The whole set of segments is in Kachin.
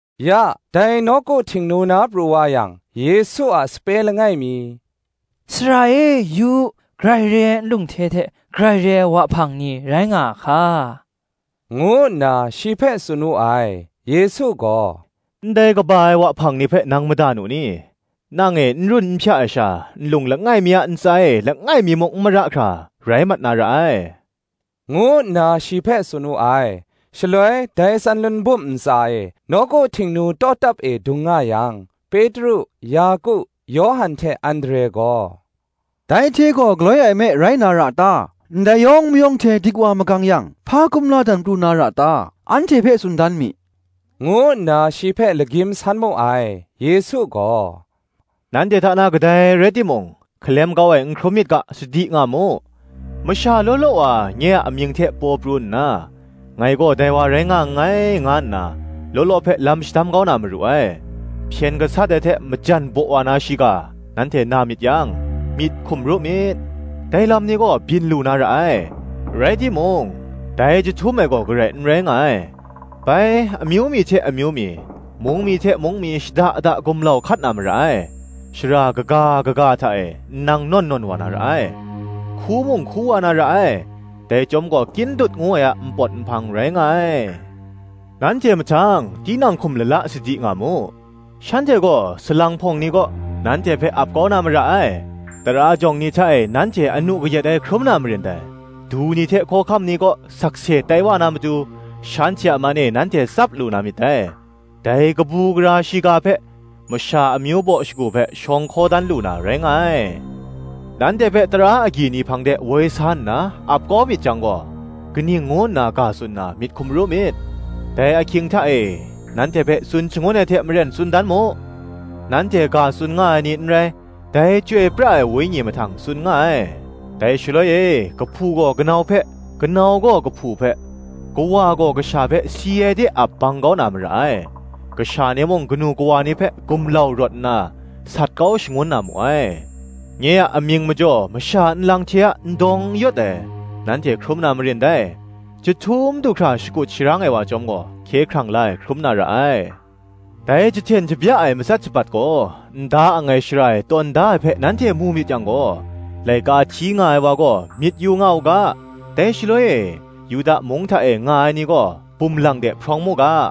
Ya, dai nawku Htingnu na pru wa yang, Yesu a sape langai mi, “Sara e, yu u: grai re ai nlung hte hte, grai re ai wahpang ni rai nga a hka!” ngu nna shi hpe tsun wu ai. Yesu gaw, “Ndai kaba ai wahpang ni hpe nang mada nu ni? nang e, n run n hpya ai sha, nlung langai mi a ntsa e langai mi muk n mara hkra, rai mat na ra ai,” ngu nna shi hpe tsun wu ai. Shaloi dai Tsanlun bum ntsa e, nawku Htingnu tawtap e, dung nga yang, Petru, Yaku, Yawhan hte Andre gaw, Dai hte gaw galoi e me rai na ra ta? ndai yawng mayawng hte dik wa magang yang, hpa kumla dan pru na ra ta? anhte hpe tsun dan mi,” ngu nna shi hpe lagyim san mu ai. Yesu gaw, “Nanhte hta na kadai rai timung, hkalem kau ai n hkrum myit ga, sadi nga mu. Masha law law wa nye a amying hte paw pru nna, Ngai gaw dai wa rai nga nngai, nga nna law law hpe lam shadam kau na maru ai. Hpyen gasat ai hte, majan baw wa na shiga, nanhte na myit yang, myit hkum ru myit: dai lam ni gaw byin lu na ra ai, rai timung, dai jahtum ai gaw garai n rai nga ai. Bai amyu mi hte amyu mi, mung mi hte mung mi shada da gumlau hkat na mara ai: shara kaga ga hta e nnang nawn nawn wa na ra ai; hku mung hku wa na ra ai: dai chyawm gaw kyin dut ngu ai a npawt nhpang rai nga ai. Nanhte mahtang, tinang hkum lala sadi nga mu: shanhte gaw, salang hpawng ni kaw, nanhte hpe ap kau na mara ai; tara jawng ni hta e nanhte anu kayat ai hkrum na marin dai; du ni hte hkawhkam ni kaw, sakse tai wa na matu, shanhte a man e nanhte tsap lu na myit dai. Dai kabu gara shiga hpe, masha amyu baw shagu hpe, shawng hkaw dan lu na, rai nga ai. Nanhte hpe tara agyi ni hpang de woi sa nna ap kau myit jang gaw, kaning ngu nna ga tsun na, myit hkum ru myit: dai ahkying hta e, nanhte hpe tsun shangun ai hte maren tsun dan mu: nanhte ga tsun nga ai ni n rai, dai Chyoi pra ai Wenyi mahtang tsun nga ai. Dai shaloi e kahpu gaw kanau hpe kanau gaw kahpu hpe, kawa gaw kasha hpe si ai de ap bang kau na mara ai: kasha ni mung kanu kawa ni hpe gumlau rawt nna, sat kau shangun na mu ai. Nye a amying majaw masha nlang hte a n dawng n yawt ai nanhte hkrum na marin dai; jahtum du hkra shakut sharang ai wa chyawm gaw, hkye hkrang la ai hkrum na ra ai. Dai jahten shabya ai matsat shabat gaw, n da ang ai shara e tawn da ai hpe nanhte mu myit yang gaw, laika hti nga ai wa gaw myit yu nga u ga; dai shaloi e, Yuda mung hta e nga ai ni gaw, bum lang de hprawng mu ga;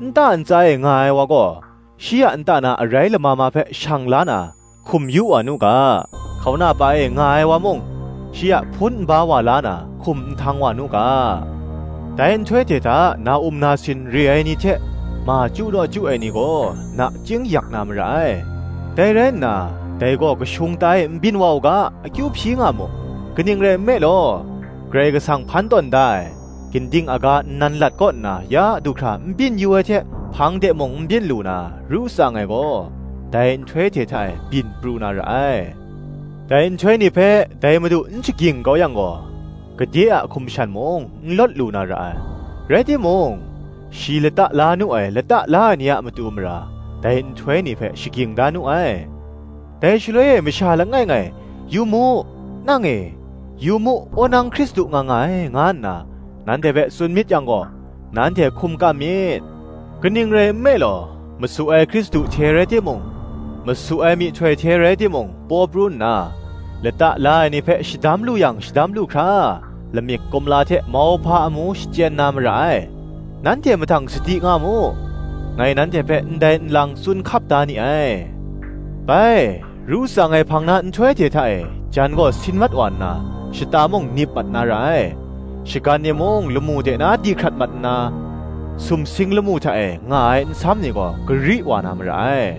nta ntsa e nga ai wa gaw, shi a nta na arai lama ma hpe shang la na, hkum yu wa nu ga; hkauna pa e nga ai wa mung, shi a hpun nba wa la na, hkum nhtang wa nu ga. Dai nhtoi hte hta na-um nasin re ai ni hte, ma chyu naw chyu ai ni gaw, nachying yak na mara ai; Dai rai nna, dai gaw kashung ta e n byin wa u ga, akyu hpyi nga mu. Kaning rai nme law, Karai Kasang hpan tawn da ai, ginding aga nnan lat kaw nna ya du hkra n byin yu ai hte, hpang de mung n byin lu na, ru tsang ai gaw, dai nhtoi hte hta e byin pru na ra ai. Dai nhtoi ni hpe, dai Madu n shagying kau yang gaw, gade a hkum shan mung, n lawt lu na ra ai; rai timung, shi lata la nu ai lata la ai ni a matu mara, dai nhtoi ni hpe shagying da nu ai. Dai shaloi e masha langai ngai, ‘Yu mu, nang e, yu mu wonang Hkristu nga nga ai, nga nna nanhte hpe tsun myit yang gaw, nanhte hkum kam myit. Kaning rai nme law, masu ai Hkristu hte rai timung, masu ai myihtoi hte rai timung, paw pru nna, lata la ai ni hpe shadam lu yang, shadam lu hkra, lamik kumla hte mauhpa amu shachyen na mara ai. Nanhte mahtang sadi nga mu: ngai nanhte hpe ndai nlang tsun hkap da ni ai. Bai, ru tsang ai hpang na nhtoi hte hta e, jan gaw sin mat wa nna, shata mung nip mat na ra ai; shagan ni mung lamu de na di hkrat mat nna, sumsing lamu hta e nga ai nsam ni gaw gari wa na mara ai.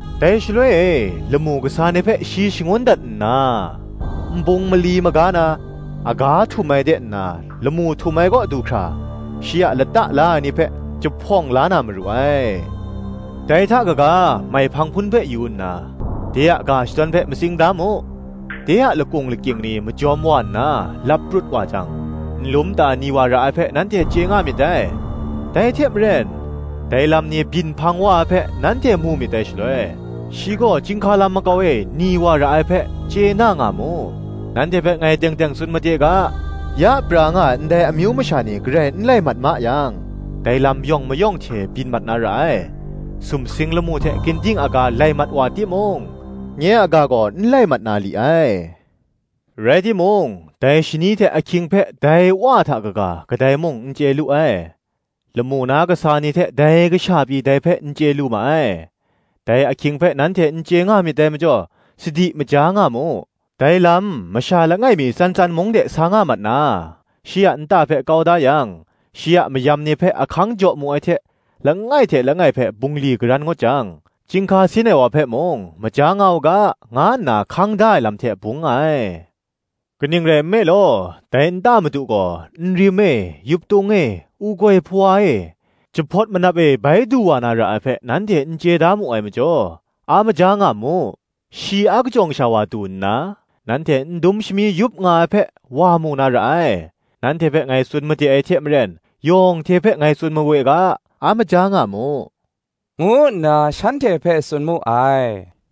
Dai shaloi e, lamu kasa ni hpe shi shangun dat nna, nbung mali maga na, aga htum ai de nna lamu htum ai kaw du hkra, shi a lata la ai ni hpe jahpawng la na maru ai. Dai hta kaga, maihpang hpun hpe yu nna, de a ga shadawn hpe matsing da mu: de a lakung lakying ni majawm wa nna lap prut wa jang, nlum ta ni wa ra ai hpe nanhte chye nga myit dai. Dai hte maren, dai lam ni byin hpang wa ai hpe, nanhte mu myit dai shaloi, Shi gaw chyinghka lam makau e ni wa ra ai hpe, chye na nga mu. Nanhte hpe ngai teng teng tsun made ga, Ya pra nga ai ndai amyu masha ni garai n lai mat ma yang, dai lam yawng mayawng hte byin mat na ra ai. Sumsing lamu hte ginding aga lai mat wa timung, nye a ga gaw n lai mat na li ai. Rai timung, dai shani hte ahkying hpe dai Wa hta kaga, kadai mung n chye lu ai: lamu na kasa ni hte dai Kasha pyi dai hpe n chye lu ma ai. Dai ahkying hpe nanhte n chye nga myit dai majaw, sadi, maja nga mu. Dai lam, masha langai mi tsan tsan mung de sa nga mat na, shi a nta hpe kau da yang, shi a mayam ni hpe ahkang jaw mu ai hte langai hte langai hpe bungli karan ngut jang, chyinghka sin ai wa hpe mung maja nga u ga, nga nna hkang da ai lam hte bung nga ai: kaning rai nme law, dai nta madu gaw, nrim e, yuptung e, u-goi hpawa e, jahpawt manap e, bai du wa na ra ai hpe nanhte n chye da mu ai majaw, a maja nga mu: shing n rai, shi akajawng sha wa du nna, nanhte n dum shami yup nga ai hpe, wa mu na ra ai. Nanhte hpe ngai tsun made ai hte maren, yawng hte hpe ngai tsun mawe ga, A maja nga mu, ngu nna shanhte hpe tsun mu ai.